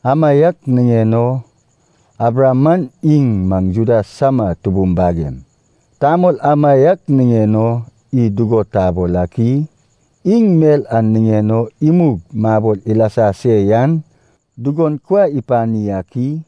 Amaiak niŋen o Abraham man iŋ maŋ Juda sama tubum bagem, tamol amaiak niŋen o id dugo tabol ak i? Iŋ mel a niŋen o imug mabol ilasa se yan dugon kuai ipani ak i?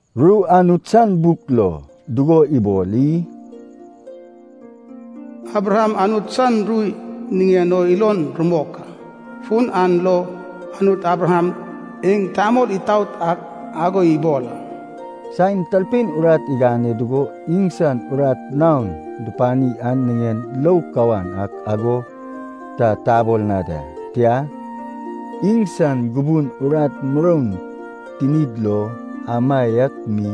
Ru Anut san buk lo dugo ibol i? “Abraham Anut san ru niŋen o ilon rumok a, fun an lo Anut Abraham iŋ tamol itaot ak ago ibol a.” Saen talpein urat igane dugo iŋsan urat naon dupani an niŋen lou kawan ak ago ta tabol na da. Tia, iŋsan gubun urat muroun tinid lo amaiak mi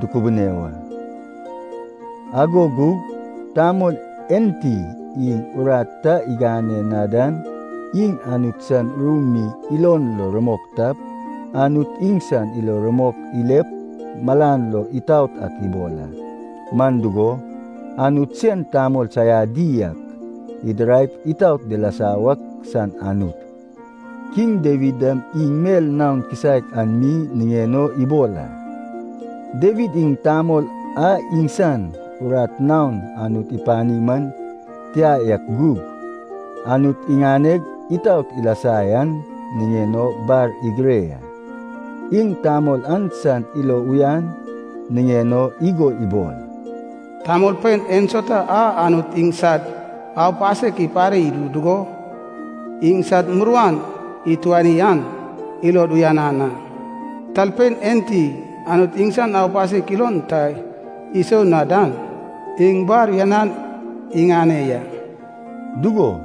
dukubune wa. Ago gug tamol enti iŋ urat ta igane na dan iŋ Anut san ru mi ilon lo rumok tap, Anut iŋsan ilo rumok ilep malan lo itaot ak ibol a. Man dugo, Anut sen tamol saiadi ak idiraip itaot dilasa wak san Anut. Kiŋ Dawid dam iŋ mel naon kisaek an mi niŋen o ibol a. Dawid iŋ tamol a iŋsan urat naon Anut ipani man tia yak gug, Anut iganeg itaot ilasa yan niŋen o bar igire ya. Iŋ tamol an san ilo uyan niŋen o igo ibol, “Tamolpein ensauta a Anut iŋsad aupasek ipare idu dugo, iŋsad muruan ituani an, ilod uyanan a. Talpein enti Anut iŋsan aupasek ilon ta isou na dan, iŋ bar uyanan iŋane ya.” Dugo,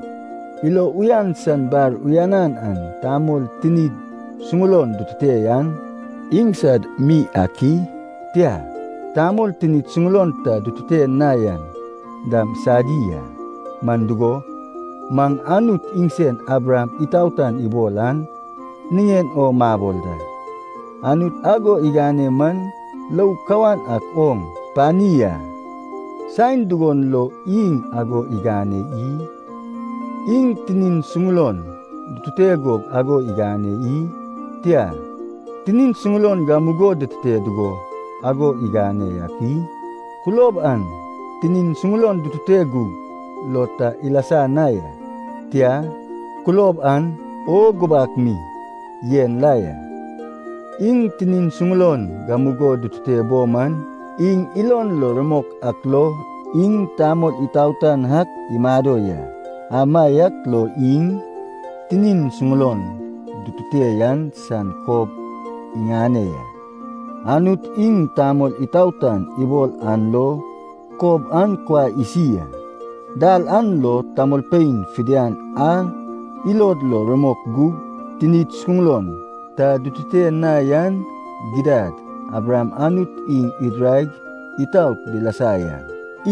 ilo uyan san bar uyanan an tamol tinid suŋulon dutute yan iŋsad mi ak i? Tia, tamol tinid suŋulon ta dutute na yan dam sadi a. Man dugo, maŋ Anut iŋsen Abraham itaotan ibol an niŋen o mabol da. Anut ago igane man lou kawan ak oŋ pani a. Saen dugon lo iŋ ago igane i? Iŋ tinin suŋulon dutute gug ago igane i? Tia, tinin suŋulon gamugo dutute dugo ago igane yak i? Kulob an tinin suŋulon dutute gug lo ta ilasa na ya, tia, kulob an o gubak mi yen la ya. Iŋ tinin suŋulon gamugo dutute bo man, iŋ ilon lo rumok ak lo iŋ tamol itaotan ak imado ya. Amaiak lo iŋ tinin suŋulon dutute yan san kob iŋane ya, Anut iŋ tamol itaotan ibol an lo kob an kuai isi a. Dal an lo tamolpein fidian a ilod lo rumok gug tinid suŋulon ta dutute na yan gidad, Abraham Anut iŋ idiraig itaot dilasa yan,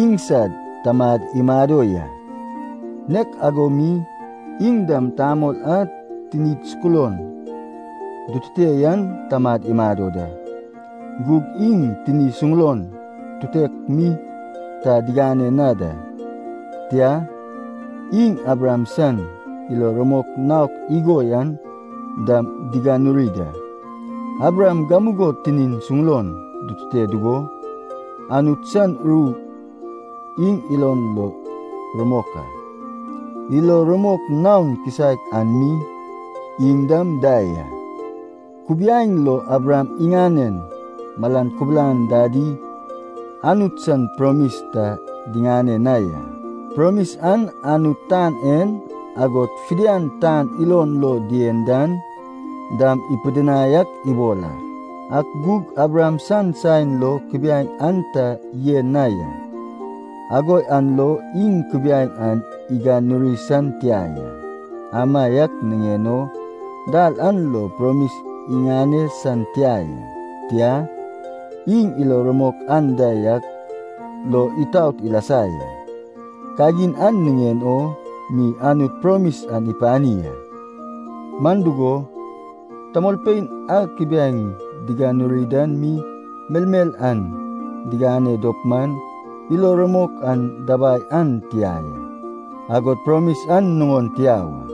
iŋsad tamad imado ya. Nek ago mi, iŋ dam tamol a tinid suŋulon dutute yan tamad imado da. Gug iŋ tini suŋulon tutek mi ta diŋane na da, tia, iŋ Abraham san ilo rumok naok igo yan dam diganuri da. Abraham gamugo tinin suŋulon dutute dugo, Anut san ru iŋ ilon lo rumok a, ilo rumok naon kisaek an mi iŋ dam da ya. Kubiaeŋ lo Abraham iŋanen malan kubulan dadi Anut san promis ta diŋane na ya. Promis an Anut tan en, agod fidian tan ilon lo dien dan dam, ipidinai ak ibol a. Ak gug Abraham san saen lo kubiaeŋ an ta yen na ya, ago yan lo iŋ kubiaeŋ an iganuri san tia ya, amaiak niŋen o dal an lo promis iŋane san tia ya. Tia, iŋ ilo rumok anda yak lo itaot ilasa ya, kagin an niŋen o mi Anut promis an ipani a. Man dugo, tamolpein a kubiaeŋ diganuri dan mi melmel an diŋane dop man, ilo rumok an dabai an tia ya, agod promis an nuŋon tia wa.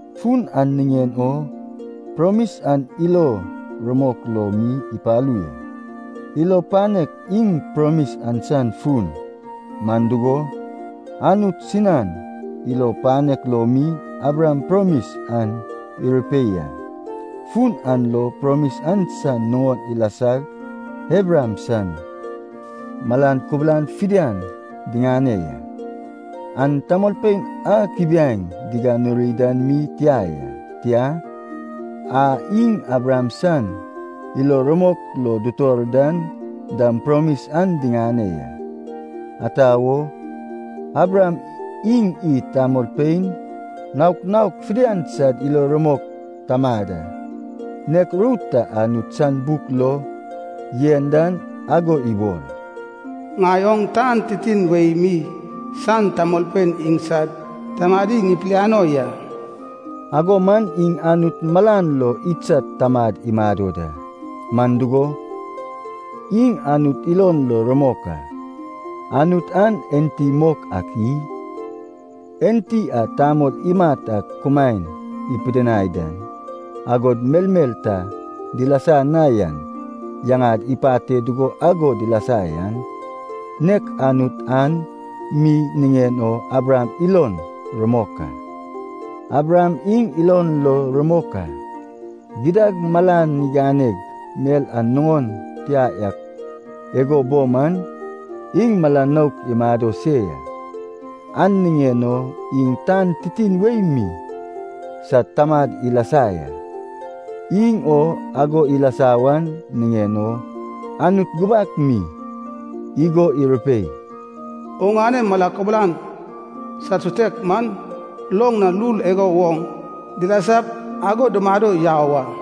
Fun an niŋen o promis an ilo rumok lo mi ipalu ya. Ilo panek iŋ promis an san fun, man dugo, Anut sinan ilo panek lo mi Abraham promis an irupei a. Fun an lo promis an san nuŋon ilasag Abraham san malan kubulan fidian diŋane ya. An tamolpein a kubiaeŋ duganuri dan mi tia ya, tia, a iŋ Abraham san ilo rumok lo dutor dan dam promis an diŋane ya. Ata wo? Abraham iŋ id tamolpein naok naok fidian sad ilo rumok tamad a. Nek ru ta Anut san buk lo yen dan ago ibol, “Ŋai oŋ tan titin wei mi san tamolpein iŋsad tamadi ŋipiliano ya.” Ago man iŋ Anut malan lo idsad tamad imado da. Man dugo, iŋ Anut ilon lo rumok a. Anut an enti mok ak i? Enti a tamol imat ak kumaen ipidinai dan, agod melmel ta dilasa na yan yaŋad ipate dugo ago dilasa yan, nek Anut an mi niŋen o Abraham ilon rumok a. Abraham iŋ ilon lo rumok a, gidad malan iganeg mel an nuŋon tia yak igo bo man, iŋ mala nouk imado se ya. An niŋen o iŋ tan titin wei mi sad tamad ilasa ya, iŋ o ago ilasa wan niŋen o Anut gubak mi igo irupei, “Oŋane mala kubulan sad sutek man loŋ na lul igo woŋ dilasap ago dumado yau a.”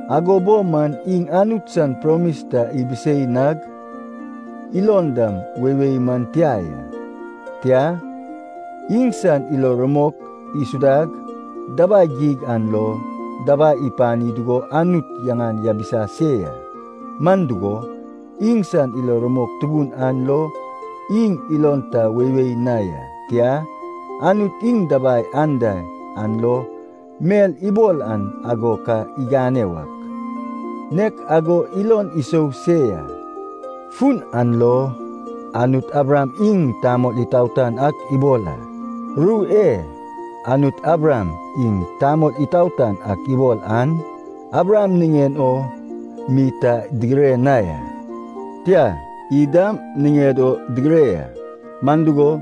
Ago bo man iŋ Anut san promis ta ibisei nag ilon dam weiwei man tia ya. Tia, iŋsan ilo rumok isudag dabai geig an lo dabai ipani dugo Anut yaŋan yabisa se ya. Man dugo, iŋsan ilo rumok tubun an lo iŋ ilon ta weiwei na ya, tia, Anut iŋ dabai anda an lo mel ibol an ago ka igane wak, nek ago ilon isou se ya. Fun an lo “Anut Abraham iŋ tamol itaotan ak ibol a.” Ru e, “Anut Abraham iŋ tamol itaotan ak ibol an” Abraham niŋen o mi ta digire na ya. Tia, id dam niŋed o digire ya. Man dugo,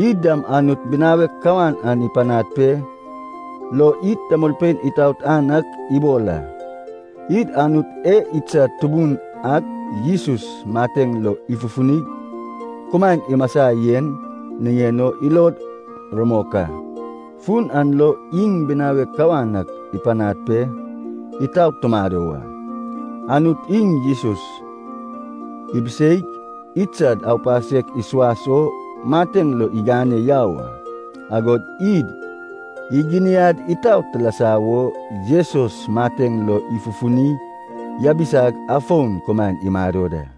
id dam Anut binawek kawan an ipanad pe lo id tamolpein itaotan ak ibol a. Id Anut e idsad Tubun ak Jesus mateŋ lo ifufunig kumaen imasa yen niŋen o ilod rumok a, fun an lo iŋ binawek kawan ak ipanad pe itaot tumado wa. Anut iŋ Jesus ibiseig idsad aupasek isuas o mateŋ lo igane yau a, agod id iginiad itaot tilasa wo Jesus mateŋ lo ifufuni yabisag afon kumaen imado da.